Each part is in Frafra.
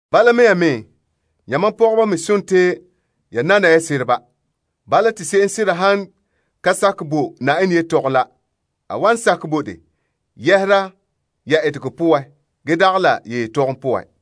Bala mea, yamam pɔgɔba me sontii ya nana ya sereba. Bala, te se'em sera han ka sakɛ bo Na'ayenɛ yetɔgom la, a wan sakɛ bo de yɛhera ya etegɔ poan ge dagɛ la ya yetɔgom poan.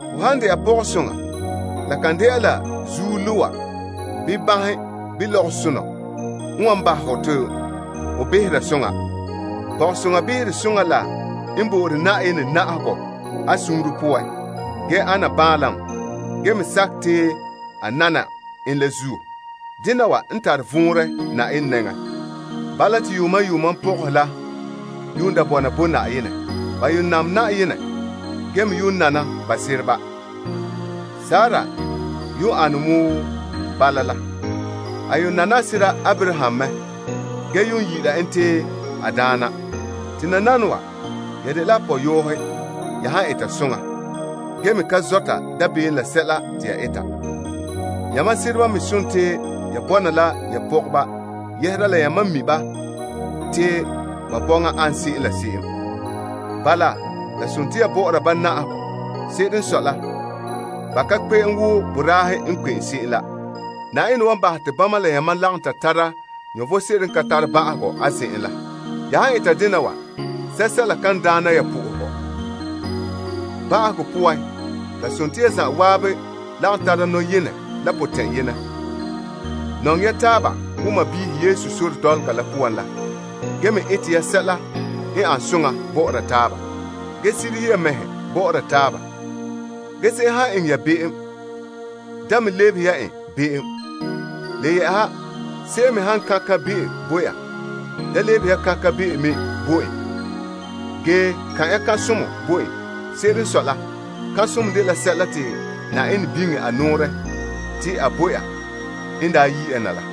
Hon han dɛna pɔgɔsoŋa la kan dɛna zuo loa bii banhe bii lɔgɔsonɔ n wan bahɛ hɔ te ho behera soŋa. Pɔgɔsoŋa behere soŋa la n bo'ore Na'ayenɛ na'ahegɔ a suunre poan ge ana baanlam ge me sakɛ te a nana en la zuo. Dena wa n tare vɔnrɛ Na'ayenɛ nɛŋa. Bala, te yuuma yuuma pɔgɔhe la yuun da bɔna bo Na'ayenɛ. Ba yuun nam Na'ayenɛ ge me yuun nana ba sereba. Sarah n yuun ane bala la. A yuun nane a sera Abraham mɛ ge yuun yi'ira en te a daana. Te nananawa, ya dela a pɔyɔɔhe ya han eta soŋa, ge me ka zɔta dabeem la sɛla te ya eta. Yamam sereba me sontii ya bɔna la ya pɔgɔba yɛhera la yamam mi' ba te ba bɔŋa ana se'em la se'em. Bala, la sontii ya bɔ'ɔra ba na'ahegɔ. Se'ere n sɔe la, ba ka kpe'em wo boraahe n kpe'em se'em la. Na'ayenɛ wan bahɛ te bama la yamam lagom ta tara vom sebo n ka tare ba'ahegɔ a zen'en la. Ya han eta dena wa sɛla kan daana ya sohogɔ. Ba'ahegɔ poan, la sontii ya zan'an lagom tara nɔyenɛ la potɛn'yenɛ. Nɔŋɛ ya taaba wo sɔɔnrɔ Yesu sore dɔlɔga la poan la ge me ete ya sɛla n ane soŋa bɔ'ɔra taaba ge sirihe ya ya mɛhe bɔ'ɔra taaba. Se'em han eŋɛ ya be'em, da me lebehe ya en be'em. Le yɛ'ɛha, se'em me han kan' kan'be'o bo ya, da lebehe ya kan' kan'be'o me bo en, ge kan' ya kan'somɔ bo en. Se'ere n sɔe la, kan'somɔ dela sɛla te Na'ayenɛ biŋe a nɔɔrɛ te a bo ya n daa yi' ya na la.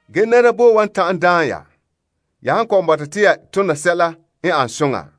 Nɛra boe wan ta'an daan ya, ya han kɔ'ɔn bɔta te ya tona sɛla n ana soŋa?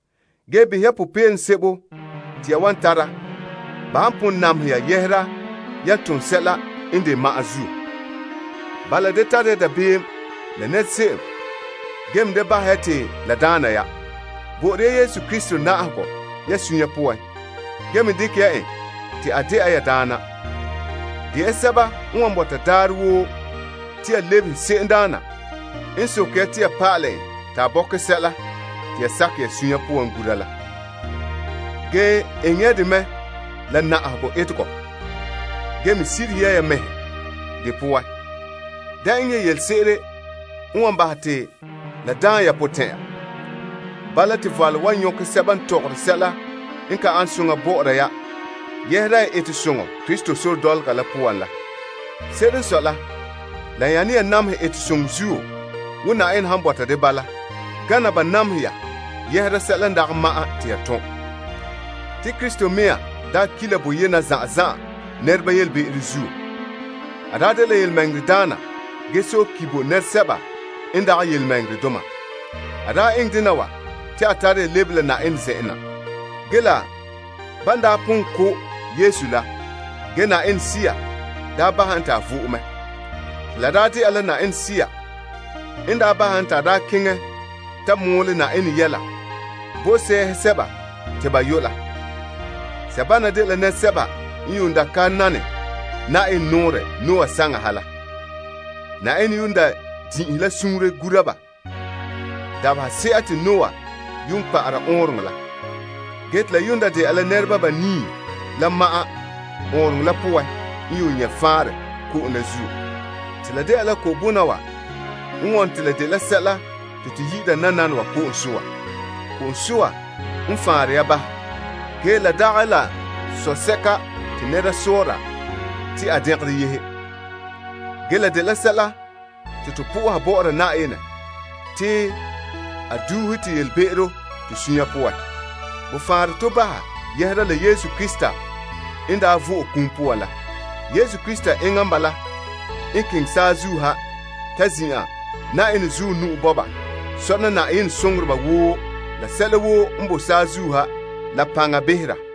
Ge behɛ ya popeelom sebo te ya wan tara ba han pon namehɛ ya yɛhera ya tom sɛla n de ma'an zuo. Bala, da tare ya dabeem la nɛra se'em ge me da bahɛ ya te la daana ya. Bo'ore ya Yesu Krista na'ahegɔ ya suunre poan ge me dekɛ ya en te a dɛna ya Daana. De ya sɛba n wan bɔta daarɛ woo te ya lebehe se'emdaana n soke ya te ya pa'alɛ en te a bɔkɛ sɛla te ya sakɛ ya sunya poan gura la. Ge eŋɛ ya dɛ mɛ la na'ahegɔ etegɔ, ge me sirihe ya mɛhe de poan. Da eŋɛ yelese'ere n wan bahɛ te la daana ya potɛn'ɛra. Bala te valom wan nyɔkɛ sɛba n tɔgɔre sɛla n ka soŋa bɔ'ɔra ya yɛhera ya etesoŋɔ Krista sore dɔlɔga la poan la. Se'ere n sɔe la, la nyane ya namehɛ etesoŋɔ zuo wo Na'ayenɛ han bɔta de bala gana ba namehɛ ya yɛhera sɛla n dagɛ ma'an te ya tom. Te Krista mɛŋa n daa ki' la boyena zan'an zan'an nɛreba yelebe'ero zuo. A daa dela yelemɛŋɛrɛdaana ge sɔe ki' bo nɛresɛba n dagɛ yelemɛŋɛrɛdoma. A daa eŋɛ dena wa te a tare ya lebe la Na'ayenɛ zen'en. La ban n daa pon ko' Yesu la, ge Na'ayenɛ Sea daa bahɛ en te a vo'e mɛ. Sea poan a daa keŋɛ ta mɔɔlɛ Na'ayenɛ yɛla bo sɛɛhe sɛba te ba yu' la. Sebana dela nɛresɛba n yuun daa ka nane Na'ayenɛ nɔɔrɛ Noah saŋa ha la. Na'ayenɛ yuun din'inhe la suunre gura ba dabahese'a te Noah yuun kpa'ara ɔɔnrɔŋɔ la. Ge te la yuun da dela nɛreba banii la ma'an ɔɔnrɔŋɔ la poan n yuun nyɛ' faanrɛ ko'om la zuo. La dela ko'bona wa n wone te la dela sɛla te to yi'ira nananawa ko'om soa. Ko'om soa n faanre ya baha. Gee la dagɛ la sosɛka te nɛra sɔɔra te a dɛngerɔ yehe. Ge la dela nɔɔrɛ te to biŋera bɔ'ɔra Na'ayenɛ te a duuhe to be'em to suunre poan. Bo faanre to baha yɛhera la Yesu Krista n daa vo'e a kum poan la. Yesu Krista enŋa n bala n keŋɛ saazuo ha ta zin'an Na'ayenɛ zuɔ nu'o sɔna Na'ayenɛ soŋoreba woo la sɛla woo n boe saazuo ha la paŋa behera.